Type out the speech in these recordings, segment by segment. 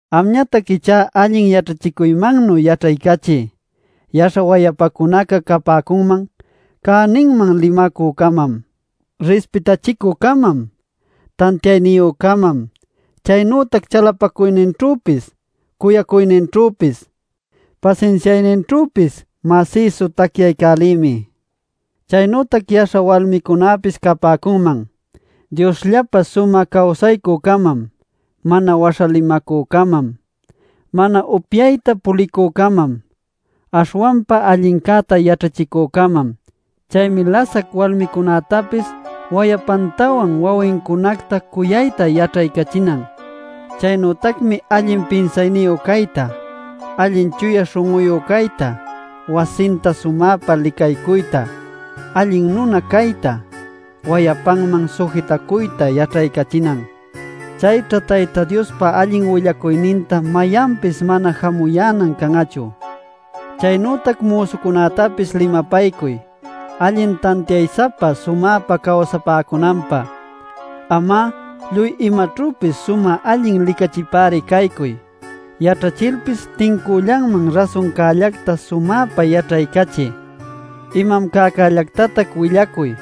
Amñatac ichá allin yaćhachicuymannu yaćhaycachiy. Yaśha wayapacunaca capäcunman: cäninman limacü-camam, rispitachicü-camam, tantiayniyü-camam, chaynütac chalapacuyninćhüpis cuyacuyninćhüpis pasinsiayninćhüpis masïsu tacyaycälïmi. Chaynütac yaśha walmicunäpis capäcunman: Diosllapä sumä cawsaycü-camam, mana waśha limacü-camam, mana upyayta pulicü-camam, aśhwanpa allincäta yaćhachicü-camam. Chaymi lasac walmicunätapis wayapantawan wawincunacta cuyayta yaćhaycachinan. Chaynütacmi allin pinsayniyu cayta, allin chuya śhun'uyu cayta, wasinta sumäpa licaycuyta, alli nuna cayta, wayapanman sujitacuyta yaćhaycachinan. Chayćha Tayta Diospa allin willacuyninta mayanpis mana jamuyänan can'achu. Chaynütac müsucunätapis limapaycuy allin tantiay-sapa sumäpa cawsapäcunanpä. Am'a lluy imaćhüpis sumä allin licachipäri caycuy. Yaćhachilpis tincüllanman rasuncällacta sumäpa yaćhaycachiy. Imam cäcällactatac willacuy;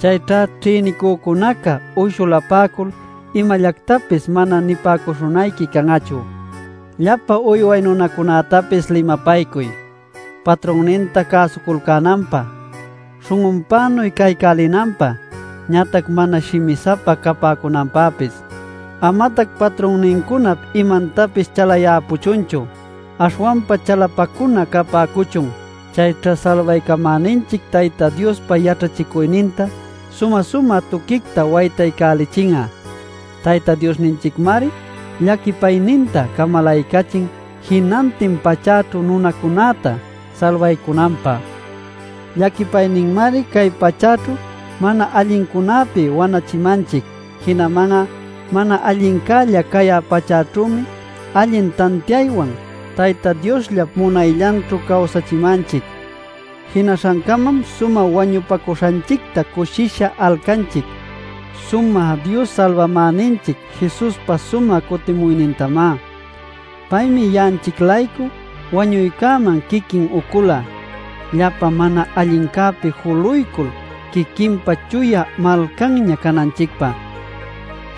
chayćha ćhïnicücunaca uyshulapäcul imallactapis mana nipäcuśhunayqui can'achu. Llapa uyway nunacunätapis limapaycuy, patrunninta cäsuculcänanpä, śhun'unpänuy caycälinanpä, ñatac mana shimi-sapa capäcunanpäpis. Amatac patrunnincunap imantapis chalayäpuchunchu, aśhwanpa chalapacuna capäcuchun. Chayćha Salbaycamäninchic Tayta Diospa yaćhachicuyninta sumä-sumä tuquicta waytaycälichin'a. Tayta Diosninchicmari llaquipayninta camalaycachin jinantin pachäćhu nunacunäta salbaycunanpä. Llaquipayninmari cay pachäćhu mana allincunäpi wanachimanchic. Jinaman'a mana allincälla cayä pachäćhümi allin tantiaywan, Tayta Diosllap munayllanćhu cawsachimanchic. Jinaśhancamam sumä wañupacuśhanchicta cushisha alcanchic: sumä Dios Salbamäninchic Jesuspa sumä cutimuynintamá. Paymi ya'anchic-laycu wañuycäman quiquin ucula llapa mana allincäpi juluycul quiquinpa chuya malcanña cananchicpä,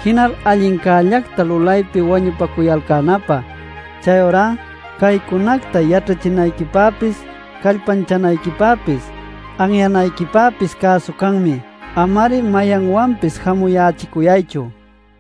jinal allincällacta lulaypi wañupacuyalcänapä. Chayurá caycunacta yaćhachinayquipäpis callpanchanayquipäpis, anyanayquipäpis cäsu canmi. Ama-ari mayanwanpis jamuyächicuyaychu.